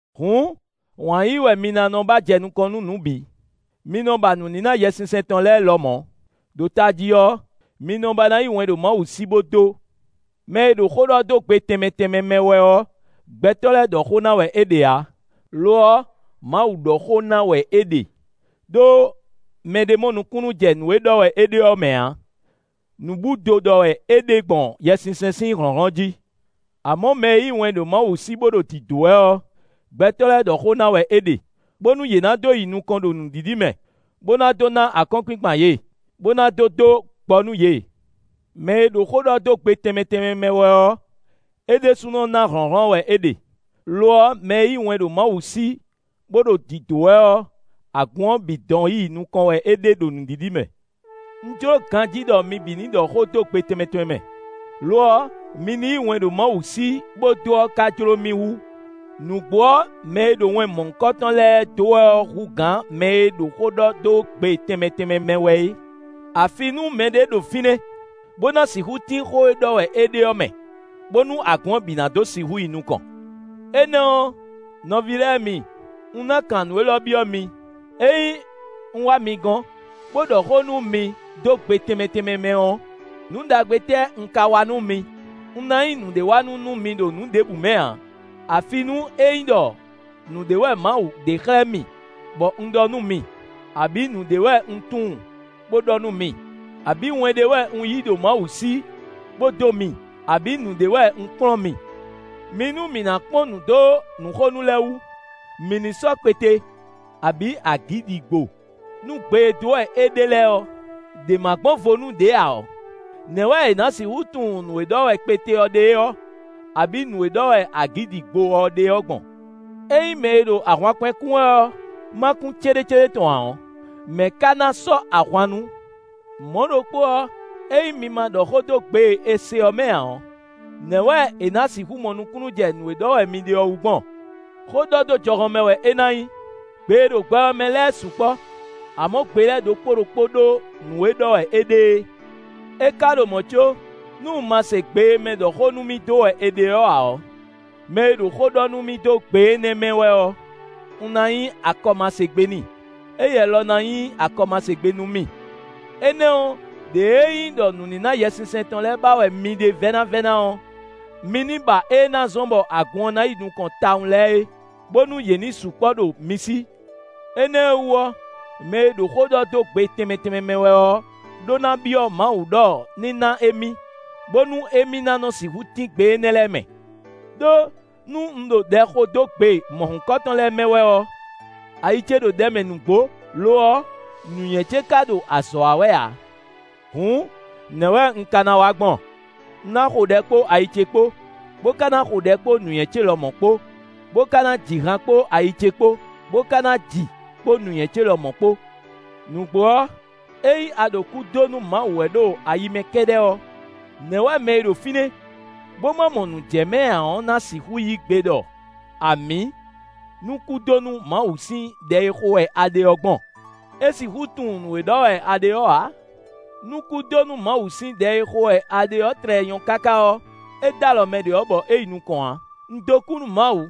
Hǔn wǎn yíyí wɛ mi ná nɔ ba jɛ nukɔn nú nǔ bǐ; mi nɔ ba nǔníná Yɛsinsɛn tɔn lɛ́ɛ lɔmɔ̌; ɖo tají ɔ́, mi nɔ ba ná yí wɛn ɖo Mawu sí bó dó. Mɛ e ɖo xó ɖɔ dó gbe tɛnmɛ tɛnmɛ mɛ wɛ ɔ́, gbɛtɔ́ lɛ́ɛ ɖɔ xó ná wɛ é ɖe ǎ; lo ɔ́, Mawu ɖɔ xó ná wɛ é ɖe; ɖó mɛɖé mɔ nukúnnú jɛ nǔ e ɖɔ wɛ é ɖe ɔ́ mɛ ǎ. Nǔbúdo ɖɔ wɛ é ɖe gbɔn Yɛsinsɛn sín hlɔ̌nhlɔ́n jí. Amɔ̌, mɛ e yí wɛn ɖo Mawu sí bó ɖo dǐdó wɛ ɔ́, gbɛtɔ́ lɛ́ɛ ɖɔ xó ná wɛ é ɖe, bónú yě ná dó yi nukɔn ɖo nǔɖiɖi mɛ, bó ná dó ná akɔ́nkpinkpan yě, bó ná dó dó gbɔ nú yě. Mɛ e ɖo xó ɖɔ dó gbe tɛnmɛ tɛnmɛ mɛ wɛ ɔ́, é ɖésúnɔ ná hlɔ̌nhlɔ́n wɛ é ɖe; lo ɔ́, mɛ e yí wɛn ɖo Mawu sí bó ɖo dǐdó wɛ ɔ́, agun ɔ́ bǐ dɔn yi nukɔn wɛ é ɖe ɖo nǔɖiɖi mɛ. Un jló ganjí ɖɔ mi bǐ ní ɖɔ xó dó gbe tɛnmɛ tɛnmɛ mɛ; lo ɔ́, mi ní yí wɛn ɖo Mawu sí bó dó ɔ́ ka jló mì hú. Nǔgbó ɔ́, mɛ e ɖo wɛn mɔ̌hunkɔtɔn lɛ́ɛ dó wɛ ɔ́ hú gǎn mɛ e ɖo xó ɖɔ dó gbe tɛnmɛ tɛnmɛ mɛ wɛ é; afi nú mɛɖé ɖo fínɛ́, bó ná sixú tín xó e ɖɔ wɛ é ɖe ɔ́ mɛ, bónú agun ɔ́ bǐ ná dó sixú yi nukɔn. Énɛ́ ɔ́, nɔví lɛ́ɛ mi, un ná kan nǔ élɔ́ byɔ́ mi: ényí un wá mi gɔ́n, bó ɖɔ xó nú mi dó gbe tɛnmɛ tɛnmɛ mɛ ɔ́, nǔ ɖagbe tɛ́ un ka wa nú mi? Un ná nyí nǔɖéwanú nú mi ɖo nǔ ɖěbǔ mɛ ǎ; afi nú é nyí ɖɔ nǔɖé wɛ Mawu ɖe xlɛ́ mì bɔ un ɖɔ nú mi; abǐ nǔɖé wɛ un tunwun bo ɖɔ nú mi, abǐ wɛn ɖé wɛ un yí ɖo Mawu sí bó dó mi; abǐ nǔɖé wɛ un kplɔ́n mi. Mi nú mǐ ná kpɔ́n nǔ dó nǔxonú lɛ́ɛ wú; mǐ ní sɔ́ kpete, abǐ agǐdigbo: nú gbe e dó wɛ é ɖe lɛ́ɛ ɔ́, ɖě ma gbɔn vo nú ɖě ǎ ɔ́, nɛ̌ wɛ è nǎ sixú tunwun nǔ e ɖɔ wɛ kpete ɔ́ ɖe ɔ́, abǐ nǔ e ɖɔ wɛ agǐdigbo ɔ́ ɖe ɔ́ gbɔn? Ényí mɛ e ɖo ahwankpɛn kún wɛ ɔ́, ma kún céɖécéɖé tɔn ǎ ɔ́, mɛ̌ ka ná sɔ́ ahwan nú? Mɔ̌ ɖokpó ɔ́, ényí mi ma ɖɔ xó dó gbe e è se ɔ́ mɛ ǎ ɔ́, nɛ̌ wɛ è nǎ sixú mɔ nukúnnú jɛ nǔ e ɖɔ wɛ mi ɖe ɔ́ wú gbɔn? Xó ɖɔ dó jɔhɔn mɛ wɛ é ná nyí. Gbe e ɖo gbɛ ɔ́ mɛ lɛ́ɛ sukpɔ́; amɔ̌ gbe lɛ́ɛ ɖokpó ɖokpó ɖó nǔ e ɖɔ wɛ é ɖe é. É ka ɖo mɔ̌ có, nú un ma se gbe e mɛ ɖɔ xó nú mì dó wɛ è ɖe ɔ́ ǎ ɔ́, mɛ e ɖo xó ɖɔ nú mì dó gbe énɛ́ mɛ wɛ ɔ́, un ná nyí akɔmasegbe n'i; éyɛ́ lɔ ná nyí akɔmasegbe nú mì. Énɛ́ ɔ́, ɖěe é nyí ɖɔ nǔníná Yɛsinsɛn tɔn lɛ́ɛ ba wɛ mi ɖe vɛ́návɛ́ná ɔ́, mi ní ba ée ná zɔ́n bɔ agun ɔ́ ná yi nukɔn tawun lɛ́ɛ é, bónú yě ní sukpɔ́ ɖo mi sí. Énɛ́ ɔ́ wú ɔ́, mɛ e ɖo xó ɖɔ dó gbe tɛnmɛ tɛnmɛ mɛ wɛ ɔ́ ɖó ná byɔ́ Mawu ɖɔ ní ná émí, bónú émí ná nɔ sixú tín gbe énɛ́ lɛ́ɛ mɛ. Đó nú un ɖo ɖɛ xo dó gbe mɔ̌hunkɔtɔn lɛ́ɛ mɛ wɛ ɔ́, ayi ce ɖo ɖɛ mɛ nǔgbó; lo ɔ́, nǔnywɛ́ ce ka ɖo azɔ̌ wa wɛ ǎ. Hǔn nɛ̌ wɛ un ka ná wa gbɔn? Un ná xo ɖɛ kpó ayi ce kpó, bó ka ná xo ɖɛ kpó nǔnywɛ́ ce lɔmɔ̌ kpó, bó ka ná ji han kpó ayi ce kpó, bó ka ná ji kpó nǔnywɛ́ ce lɔmɔ̌ kpó. Nǔgbó ɔ́, ényí a ɖo kú dó nú Mawu wɛ ɖo ayi mɛ kɛ́ɖɛ́ ɔ́, nɛ̌ wɛ mɛ e ɖo fínɛ́, bó ma mɔ nǔ jɛ mɛ ǎ ɔ́ ná sixú yí gbe ɖɔ “Amǐ” nú kú dó nú Mawu sín ɖɛ e xo wɛ a ɖe ɔ́ gbɔn? É sixú tunwun nǔ e ɖɔ wɛ a ɖe ɔ́ ǎ. Nú kú dó nú Mawu sín ɖɛ e xo wɛ a ɖe ɔ́ tlɛ nyɔ́ káká ɔ́, é d'alɔ mɛ ɖě ɔ́ bɔ é yi nukɔn ǎ. Un dó kú nú Mawu,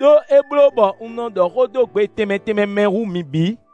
ɖó é bló bɔ un nɔ ɖɔ xó dó gbe tɛnmɛ tɛnmɛ mɛ hú mi bǐ.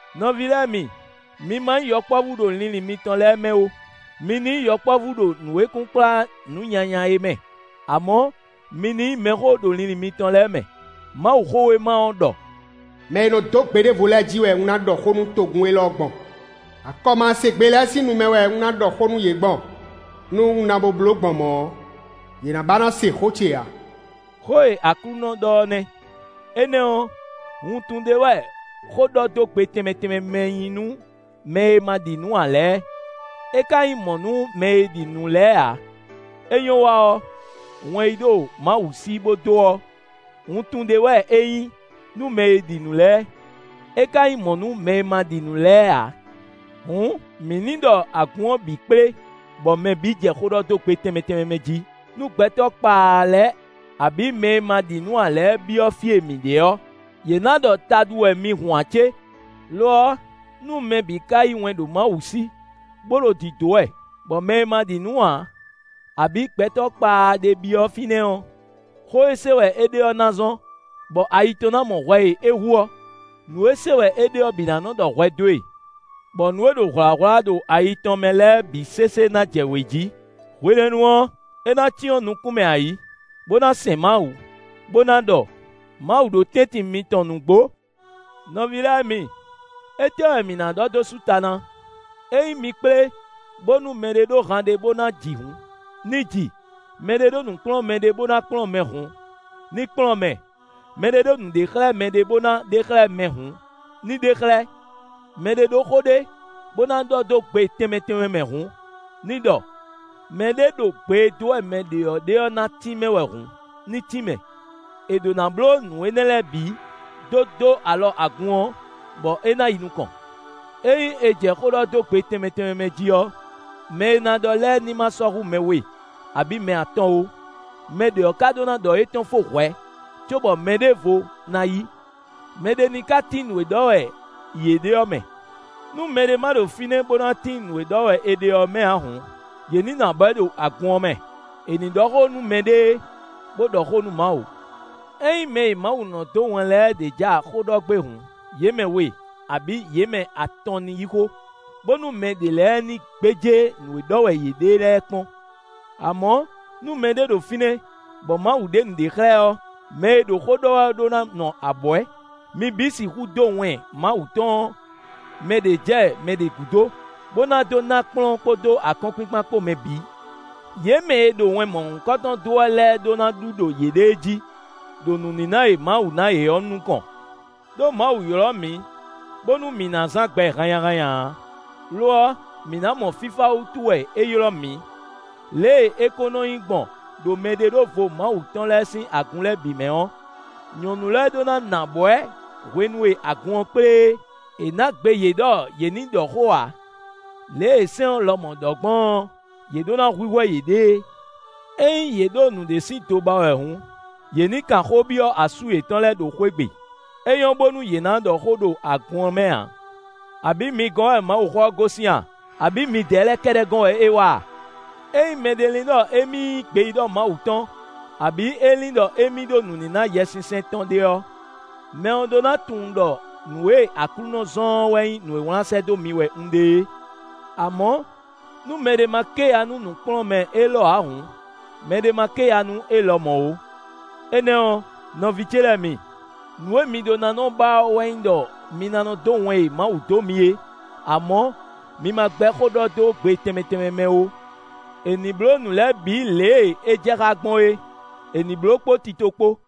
Nɔví lɛ́ɛ mi, mi ma nyí yɔkpɔ́vú ɖo linlin mitɔn lɛ́ɛ mɛ ó; mi ní nyí yɔkpɔ́vú ɖo nǔ e kunkplá nǔ nyanya é mɛ; amɔ̌, mi ní nyí mɛxó ɖo linlin mitɔn lɛ́ɛ mɛ. Mawuxówéma ɔ́ ɖɔ: “Mɛ e nɔ dó gbe ɖěvo lɛ́ɛ jí wɛ un ná ɖɔ xó nú togun élɔ́ gbɔn; akɔmasegbe lɛ́ɛ sín nu mɛ wɛ un ná ɖɔ xó nú yě gbɔn; nú un na bo bló gbɔn mɔ̌ ɔ́, yě ná ba ná se xó ce ǎ.” Xó e Aklúnɔ ɖɔ ɔ́ nɛ́. Énɛ́ ɔ́, wuntun ɖé wɛ xó ɖɔ dó gbe tɛnmɛ tɛnmɛ mɛ nyí nú mɛ e ma ɖi nǔ ǎ lɛ́ɛ; é ka nyí mɔ̌ nú mɛ e ɖi nǔ lɛ́ɛ ǎ; é nyɔ́ wa ɔ́, wɛn yí ɖo Mawu sí bó dó ɔ́, wuntun ɖé wɛ é nyí nú mɛ e ɖi nǔ lɛ́ɛ, é ka nyí mɔ̌ nú mɛ e ma ɖi nǔ lɛ́ɛ ǎ. Hǔn, mǐ ní ɖɔ agun ɔ́ bǐ kplé bɔ mɛ bǐ jɛ xó ɖɔ dó gbe tɛnmɛ tɛnmɛ mɛ jí: nú gbɛtɔ́ kpaa lɛ́ɛ abǐ mɛ e ma ɖi nǔ ǎ lɛ́ɛ byɔ́ fí e mi ɖe ɔ́, yě ná ɖɔ taɖu wɛ mi hun ǎ cé? Lo ɔ́, nú mɛ bǐ ka yí wɛn ɖo Mawu sí bó ɖo dǐdó wɛ, bɔ mɛ e ma ɖi nǔ ǎ, abǐ gbɛtɔ́ kpaa ɖé byɔ́ fínɛ́ ɔ́, xó e se wɛ é ɖe ɔ́ ná zɔ́n, bɔ ayi tɔn ná mɔ hwɛ e é hu ɔ́; nǔ e se wɛ é ɖe ɔ́ bǐ ná nɔ ɖɔ hwɛ dó e. Bɔ nǔ e ɖo hwlǎhwlá ɖo ayi tɔn mɛ lɛ́ɛ bǐ sésé ná jɛ wě jí. Hwenɛ́nu ɔ́, é ná cyɔ́n nukún mɛ ayǐ, bó ná sɛn Mawu, bó ná ɖɔ: “Mawu ɖo tɛ́ntin mitɔn nǔgbó.” Nɔví lɛ́ɛ mi, étɛ́ wɛ mǐ ná ɖɔ dó sú ta ná? Ényí mi kplé, bónú mɛɖé ɖó han ɖé bó ná ji hǔn, ní ji; mɛɖé ɖó nǔkplɔ́nmɛ ɖé bó ná kplɔ́n mɛ hǔn, ní kplɔ́n mɛ; mɛɖé ɖó nǔɖexlɛ́mɛ ɖé bó ná ɖe xlɛ́ mɛ hǔn, ní ɖe xlɛ́; mɛɖé ɖó xó ɖé bó ná ɖɔ dó gbe tɛnmɛ tɛnmɛ mɛ hǔn, ní ɖɔ; mɛɖé ɖo gbe e dó wɛ mɛ ɖě ɔ́ ɖe ɔ́ ná tínmɛ wɛ hǔn, ní tínmɛ; è ɖǒ ná bló nǔ énɛ́ lɛ́ɛ bǐ, dó dó alɔ agun ɔ́, bɔ é ná yi nukɔn. Ényí è jɛ xó ɖɔ dó gbe tɛnmɛ tɛnmɛ mɛ jí ɔ́, mɛ e ná ɖɔ lɛ́ɛ ní ma sɔ́ hú mɛ we, abǐ mɛ atɔn ó; mɛ ɖě ɔ́ ka ɖó ná ɖɔ étɔn fó hwɛ̌, cóbɔ mɛɖěvo ná yí; mɛɖé ní ka tín nǔ e ɖɔ wɛ yě ɖe ɔ́ mɛ. Nú mɛɖé ma ɖo fínɛ́ bó ná tín nǔ e ɖɔ wɛ è ɖe ɔ́ mɛ ǎ hǔn, yě ní nɔ abwɛ̌ ɖo agun ɔ́ mɛ; è nǐ ɖɔ xó nú mɛɖée, bó ɖɔ xó nú Mawu. Ényí mɛ e Mawu nɔ dó wɛn lɛ́ɛ ɖě ja xó ɖɔ gbé hǔn, yě mɛ we, abǐ yě mɛ atɔn ní yí xó, bónú mɛ ɖě lɛ́ɛ ní gbéjé nǔ e ɖɔ wɛ yě ɖe lɛ́ɛ kpɔ́n. Amɔ̌, nú mɛɖé ɖo fínɛ́ bɔ Mawu ɖe nǔɖé xlɛ́ ɛ ɔ́, mɛ e ɖo xó ɖɔ wɛ ɔ́ ɖó ná nɔ abwɛ̌. Mi bǐ sixú dó wɛn Mawu tɔn ɔ́, mɛ ɖě jɛ mɛ ɖě gúdo, bó ná dó ná kplɔ́n kpódó akɔ́nkpinkpan kpó mɛ bǐ. Yě mɛ e ɖo wɛn mɔ̌hunkɔtɔn dó wɛ lɛ́ɛ ɖó ná ɖu ɖo yěɖée jí, ɖo nǔníná e Mawu ná yě ɔ́ nukɔn. Đó Mawu ylɔ́ mǐ, bónú mǐ ná zán gbɛ hannyahannya ǎ, lo ɔ́, mǐ ná mɔ fífá wútu wɛ é ylɔ́ mǐ. Lě e é kó nɔ nyí gbɔn ɖo mɛɖeɖóvo Mawu tɔn lɛ́ɛ sín agun lɛ́ɛ bǐ mɛ ɔ́, nyɔ̌nu lɛ́ɛ ɖó ná nɔ abwɛ̌ hwenu e agun ɔ́ kplé é: è nǎ gbe yě ɖɔ yě ní ɖɔ xó ǎ; lě e sɛ́n ɔ́ lɔmɔ̌ ɖɔ gbɔn ɔ́, yě ɖó ná hwíhwɛ́ yěɖée. Ényí yě ɖo nǔɖé sín do ba wɛ hǔn, yě ní kan xó byɔ́ asú yětɔn lɛ́ɛ ɖo xwé gbe. É nyɔ́ bónú yě ná ɖɔ xó ɖo agun ɔ́ mɛ ǎ. Abǐ mi gɔ́n wɛ Mawuxó ɔ́ gosín a? Abǐ midɛɛ lɛ́ɛ kɛ́ɖɛ́ gɔ́n wɛ é wá a? Ényí mɛɖé lin ɖɔ émí nyí gbeyíɖɔ Mawu tɔn, abǐ é lin ɖɔ émí ɖó nǔníná Yɛsinsɛn tɔn ɖé ɔ́, mɛ ɔ́ ɖó ná tunwun ɖɔ nǔ e Aklúnɔ zɔ́n ɔ́ wɛ nyí nǔ e wlán sɛ́ dó mi wɛ un ɖe é. Amɔ̌, nú mɛɖé má ké ya nú nǔkplɔ́nmɛ élɔ́ ǎ hǔn, mɛɖé má ké ya nú é lɔmɔ̌ ó. Énɛ́ ɔ́, nɔví ce lɛ́ɛ mi, nǔ e mi ɖó ná nɔ ba ɔ́ wɛ nyí ɖɔ mi ná nɔ dó wɛn e Mawu dó mi é; amɔ̌, mi ma gbɛ́ xó ɖɔ dó gbe tɛnmɛ tɛnmɛ mɛ ó. È nǐ bló nǔ lɛ́ɛ bǐ lě e é jɛ xá gbɔn é; è nǐ bló kpó tito kpó.